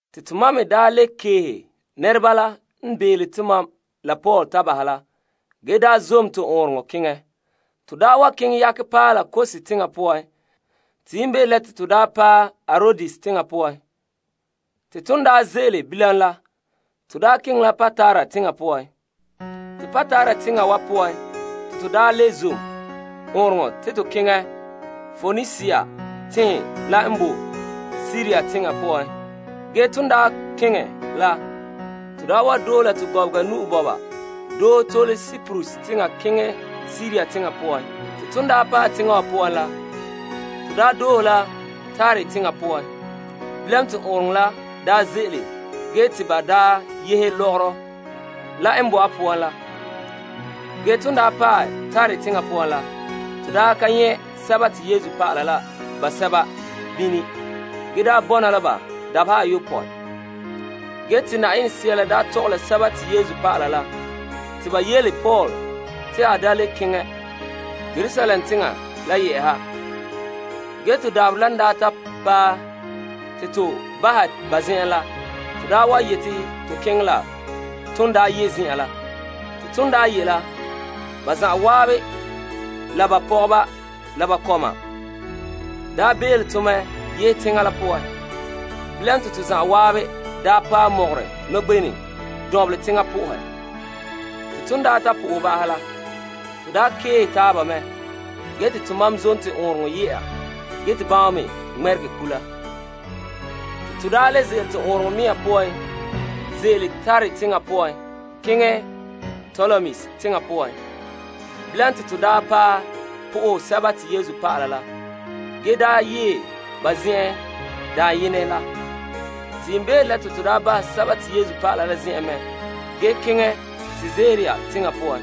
Te tomam me le keehe nɛreba la n bele tomam la Paul ta bahɛ la ge zom to ɔɔnrɔŋɔ kantɛ keŋɛ. To wa keŋɛ yakɛ paɛ la Kos teŋa poan te yiimbeere la te to paɛ Arodes teŋa poan. Te ton ze'ele bilam la, to keŋɛ la Patara teŋa poan. Te Patara teŋa wa poan te to le zom ɔɔnrɔŋɔ kantɛ te to keŋɛ Poenisia tenhen la n bo Siria teŋa poan. Ge te ton kene la, to wa doohe la to gɔbega nu'o bɔba doohe tole Kiprus teŋa poan keŋɛ Siria teŋa poan. Te ton paɛ teŋa wa poan la, to daa doohe la Tire teŋa poan. Bilam te ɔɔnrɔŋɔ kantɛ la daa ze'ele ge te ba yehe lɔgɔrɔ la n bo a poan la. Ge ton paɛ Tire teŋa poan la, to nyɛ' Yesu dɔlɔba la basɛba bene ge daa bɔna la ba dabeha ayopɔe. Ge te Yenɛ Sea la tɔgɛ la Yesu dɔlɔba la te ba yele Paul te a da le keŋɛ Yerusalem teŋa la yɛ'ɛha. Ge to dabaherɛ la n ta paɛ te to bahɛ ba zen'en la, to yete to keŋɛ la ton ye' zen'an la. Te ton ye' la, ba zan'an la ba pɔgɔba la ba kɔma bele to mɛ yehe teŋa la poan. Bilam te to zan'an paɛ mɔgɔrɛ nɔgbenɛ dɔnbelɛ teŋa po'ohɛ. Te ton ta po'ohɛ ba'ahɛ la, to keehe taaba mɛ ge te tomam zom to ɔɔnrɔŋɔ kantɛ ye'a ge te bama me ŋmɛregɛ kula. Te to le bɔna to ɔɔnrɔŋɔ kantɛ mea poan ze'ele Tire teŋa la poan keŋɛ Ptolemais teŋa poan. Bilam te to paɛ po'ohɛ Yesu dɔlɔba la ge daa yee ba zen'en dayenɛ la. Te yiimbeere la to bahɛ Yesu dɔlɔba la zen'en mɛ ge keŋɛ Kaesarea teŋa poan.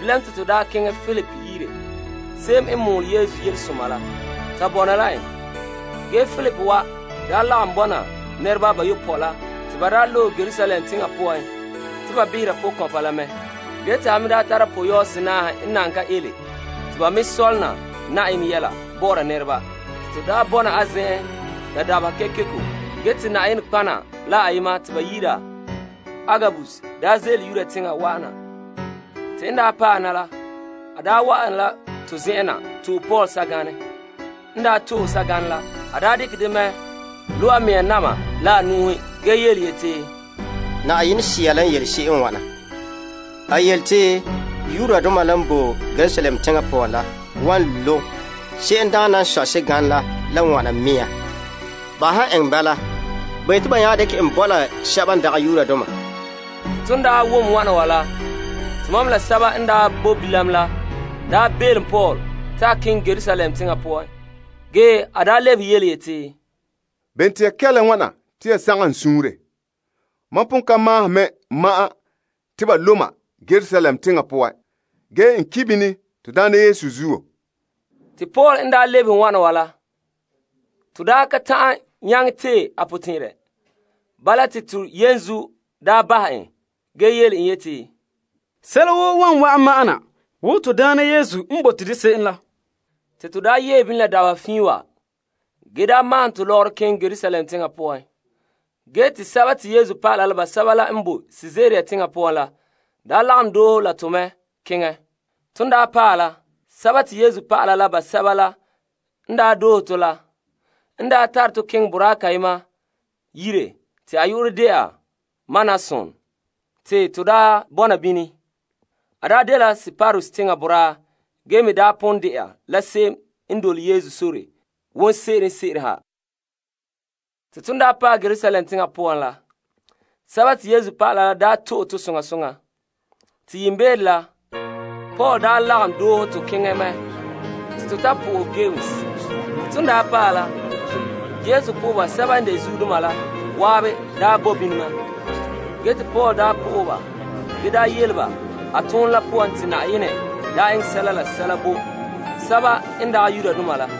Bilam to kɛn'ɛra Filip yire, se'em n mɔɔlɛ Yesu Yelesoma la, ta bɔna la en. Ge Filip wa daa lagom bɔna nɛreba bayopɔe la te ba daa loe Yerusalem teŋa poan te ba behera pɔkɔnpa la mɛ. Ge te a me daa tara pɔyɔɔhe senaahe n nana ka ele te ba me sɔlena Yenɛ yɛla bɔ'ɔra nɛreba. Te to daa bɔna a zen'en la dabeha kekeko ge te nɔtɔgɔheba la ayema te ba yi'ira en Agabus daa ze'ele Yudea teŋa wa'an na. Te n daa paɛ na la, a wa'an la to zen'en na to'e Paul sɛganɛ, dekɛ dɛ mɛ lo' a mea na'ma la a nu'uhen ge yeti, Yenɛ Sea la n yele se'em n wana. A yele te Yudoma la n bo Yerusalem teŋa poan la wan lo' se'emdaana n sɔe sɛganɛ la la wana mea nɔɔ. Ba han eŋɛ bala, ba yete ba nya dekɛ en bo la sɛba n dagɛ Yudoma. Te ton wom wana wa la, tomam la sɛba n bo bilam la belom Paul te a da keŋɛ Yerusalem teŋa poan. Ge a lebehe yeti, Bene te ya kɛla wana te ya sagom n suunre? Mam pon ka mahona me ma'an te ba lo' ma Yerusalem teŋa poan, ge n ki' bini to Daana Yesu enŋa zuo. Paul n lebehe wana wa la, to daa ka ta'an nyaŋɛ tee a potɛn'ɛrɛ. Bala te to yenzuo bahɛ en ge yeti, Sɛla woo wa wa'an ma'an na wo to Daana Yesu n bote de se'em la. Te to daa yee bini la dabeha fiin wa ge daa maahom to lɔgɔrɔ keŋɛ Yerusalem teŋa poan. Ge te Yesu dɔlɔba la basɛba la n bo Kaesarea teŋa poan la lagom doohe to mɛ keŋɛ. Ton paɛ la, Yesu dɔlɔba la basɛba la n doohe to la, n tare to keŋɛ boraa kayema yire te a yu'urɛ de'a Mnason te to daa bɔna bini. A dela Kiprus teŋa boraa ge me pon de'a la se'em n dole Yesu sore wonseren wonseren ha. Te ton daa paɛ Yerusalem teŋa poan la, Yesu dɔlɔba la daa to'e to soŋa soŋa. Te yiimbeere la, Paul lagom doohe to keŋɛ mɛ te to ta po'ohɛ Yames. Te ton paɛ la, Yesu po'oheba sɛba n de zuodoma la zan'an bo bini mɛ. Paul n daa po'ohɛ ba ge yele ba a ton la poan te Yenɛ daa eŋɛ sɛla la sɛla bo sɛba n dagɛ Yudoma la.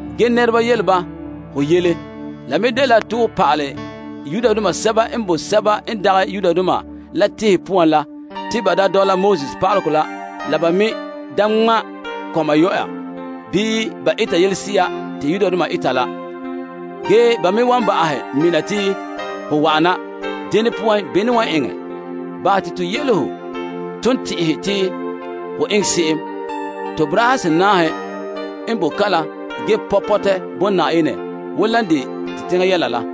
Ge ba wom ho yele te ho pa'alɛ Yudoma la waabe n bo sɛba n dagɛ Yudoma la tenhen poan la te ba da dɔla Moses yɛla la ba me da ŋma' kɔma yɔya bii dɔla Yudoma malema la. Ge ba me wan ba'ahɛ mina te ho wa'an na. Dene poan bene n wan eŋɛ? Bahɛ te to yele ho ton tɛn'ɛhe te ho eŋɛ se'em. To boraahe senaahe n bo kalam ge pɔ' pɔtɛ bo Yenɛ wo lan de to teŋa yɛla la.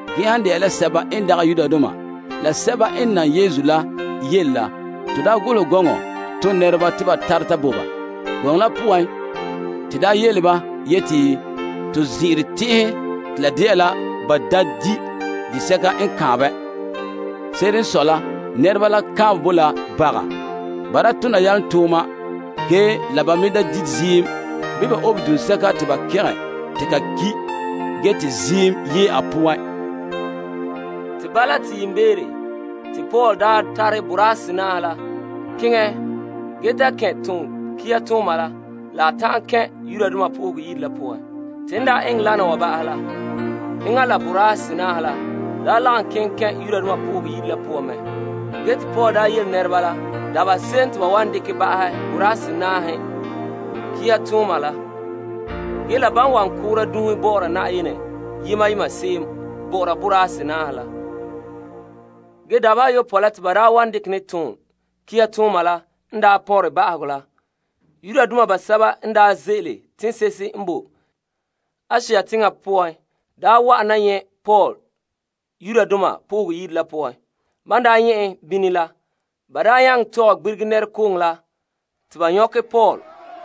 Ge han de'a la sɛba n dagɛ Yudoma la sɛba n nam Yesu la yele la, to daa golehɛ gɔŋɔ ton nɛreba te ba tare ta bo ba. Gɔŋɔ la poan te daa yele ba yeti to zin'ire tɛn'ɛhɛ te la de'a la ba da di' disɛka n kaanbɛ. Se'ere n sɔe la nɛreba la kaanbɛ bo la baga. Ba daa tona yalomtooma ge la ba me da di' ziim bii ba obe duŋsɛka te ba gɛngɛ te ka ki' ge te ziim yee a poan. Te bala te yiimbeere te Paul daa tare boraa senaahe la keŋɛ ge ta kɛn' ton kihatooma la la a ta'an kɛn' Yenɛ Yire la poan. Te n daa eŋɛ lana wa ba'ahɛ la, enŋa la boraahe senaahe la daa lagom keŋɛ kɛn' Yenɛ Yire la poan mɛ. Ge te Paul daa yele nɛreba la dabeha se'em te ba wan dekɛ ba'ahɛ boraahe senaahe kihatooma la. Ge la ban wan koora dunhe bɔ'ɔra Yenɛ yema yema se'em bɔ'ɔra boraahe senaahe la. Ge dabeha ayopɔe n daa pɔnren ba'ahegɔ la, Yudoma basɛba n ze'ele teŋse'ehe n bo Asia teŋa poan wa'an na nyɛ' Paul Yenɛ Yire la poan. Ban daa nyɛ' en bini la, ba nyaŋɛ tɔgɛ gbirige nɛrekooŋɔ la te ba nyɔkɛ Paul.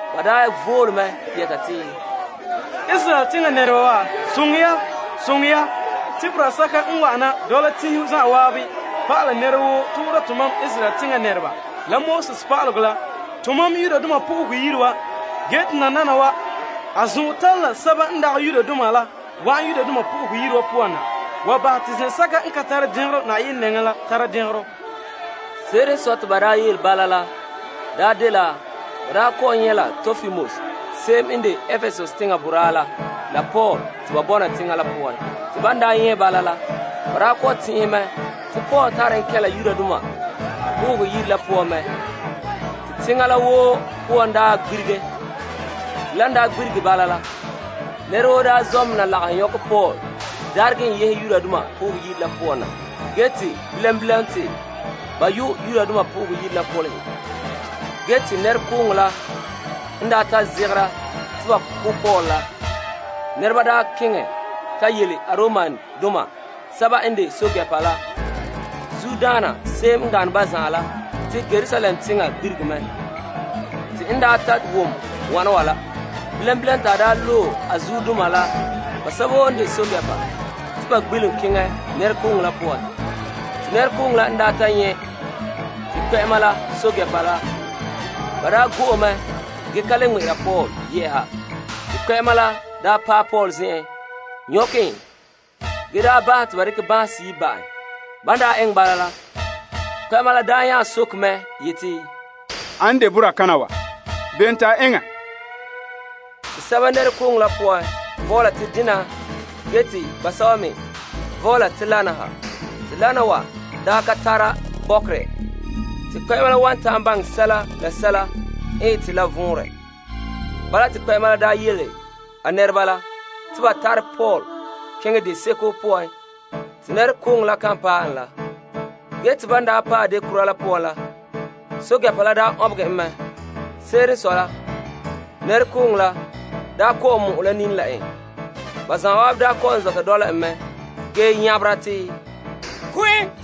Ba vole mɛ yɛta te, Israeldoma wa, soŋɛ ya soŋɛ ya! Te boraa la n wana n dole tenhen zan'an pa'ala nɛra woo toora tomam Israel teŋa nɛreba la to pa'alegɔ la to toolom zen'an wa. Ge te nananawa, a zɔn'ɔn tare la Greekdoma la wa'an Yenɛ Yire la poan. Te a bahɛ te toolom zen'an tare dɛngerɔ Yenɛ nɛŋa. Se'ere n sɔe te ba daa yele bala la daa dela ba daa kɔ'ɔn nyɛ' la Tropimus se'em n de Epesus teŋa boraa la la Paul te ba bɔna teŋa la poan. Te ban daa nyɛ' bala la, ba daa kɔ'ɔn tɛn'ɛhɛ mɛ te Paul tare en kɛn' Yenɛ Yire la poan mɛ. Te teŋa la woo poan daa gbirige. Te lan daa gbirige bala la, nɛra woo zɔ' mɛ na lagahɛ nyɔkɛ Paul daaregɛ en yehe Yenɛ Yire la poan na. Ge te bilam bilam te ba yu' Yenɛ Yire la kolehe. Ge te nɛrekooŋɔ la n ta zegera te ba ko' Paul la, nɛreba keŋɛ ta yele Aromdoma sɛba n de pɛɛntɛɛnreba la zuodaana se'em n gane ba zan'an la te Yerusalem teŋa gbirige mɛ. Te n ta wom wana wa la, bilam bilam te a loe a zuodoma la basɛba woo n de pɛɛntɛɛnreba te ba gbelom keŋɛ nɛrekooŋɔ la poan. Te nɛrekooŋɔ la n ta nyɛ' te kpɛ'ɛma la pɛɛntɛɛnreba la, ba go'e mɛ ge ka le ŋmɛ'ɛra Paul yɛ'ɛha. Te kpɛ'ɛma la paɛ Paul zen'en nyɔkɛ en ge bahɛ te ba dekɛ banhe seyi' ba' en. Ban daa eŋɛ bala la, kpɛ'ɛma la nya soke mɛ yeti, Ane n de boraa kana wa, bene te a eŋɛ? Te sɛba nɛrekooŋɔ la poan vɔɔla te dena ge te basɛba me me vɔɔla te lana ha. Te lana wa ka tare bɔkerɛ te kpɛ'ɛma la wan ta'an baŋɛ sɛla la sɛla n ete la vɔnrɛ. Bala te kpɛ'ɛma la yele a nɛreba la te ba tare Paul keŋɛ deseko poan te nɛrekooŋɔ la kan paɛ en la. Ge te ban daa paɛ deo kura la poan la, pɛɛntɛɛnreba la ɔnbegɛ en mɛ. Se'ere n sɔe la nɛrekooŋɔ la kɔ'ɔn mɔ'ɛ la nini la en. Ba zan'an kɔ'ɔn zɔta dɔla en mɛ ge nyabera te, Ko' en!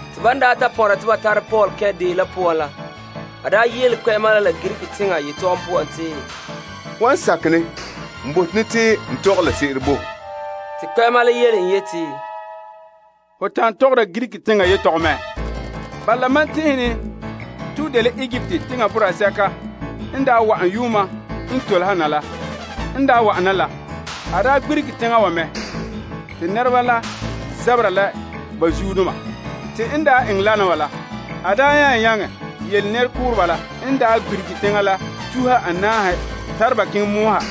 Te ban ta pɔnra te ba tare Paul kɛn' deo la poan la, a yele kpɛ'ɛma la la Greek teŋa yetɔgom poan te, Ho han sakɛ ne n bote ne te n tɔgɛ la se'ere bo ho. Te kpɛ'ɛma la yele en yeti, Ho tan' tɔgɔra Greek teŋa yetɔgom mɛ? Bala mam tɛn'ɛhɛ ne te ho dela Egipt teŋa boraa sɛka n daa wa'an yuuma n tole ha na la. N daa wa'an na la, a daa gbirige teŋa wa mɛ te nɛreba la zabera la ba zuodoma. Te n daa eŋɛ lana wa la, a daa nya nyaŋɛ yele nɛrekooreba la n daa gbirige teŋa la tuha anaahe tare ba keŋɛ mɔɔ ha.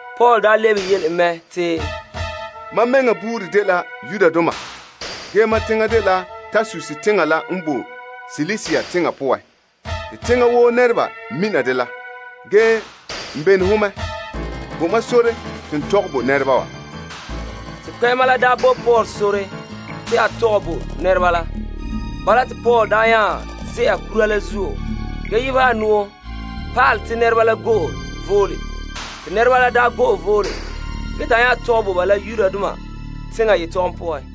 Paul lebehe en mɛ te, Mam mɛŋa buuri dela Yudoma ge mam teŋa dela Tarsus teŋa la n bo Silisia teŋa poan. Te teŋa woo nɛreba mina dela. Ge n bene ho mɛ, bo mam sore te n tɔgɛ bo nɛreba wa. Te kpɛ'ɛma la bo Paul sore te a tɔgɛ bo nɛreba la. Bala te Paul nya ze'a kura la zuo ge yebehɛ a nu'o pa'ala te nɛreba la go'e vole. Te nɛreba la go'e vole ge ta a nya tɔgɛ bo ba la Yudoma yetɔgom poan.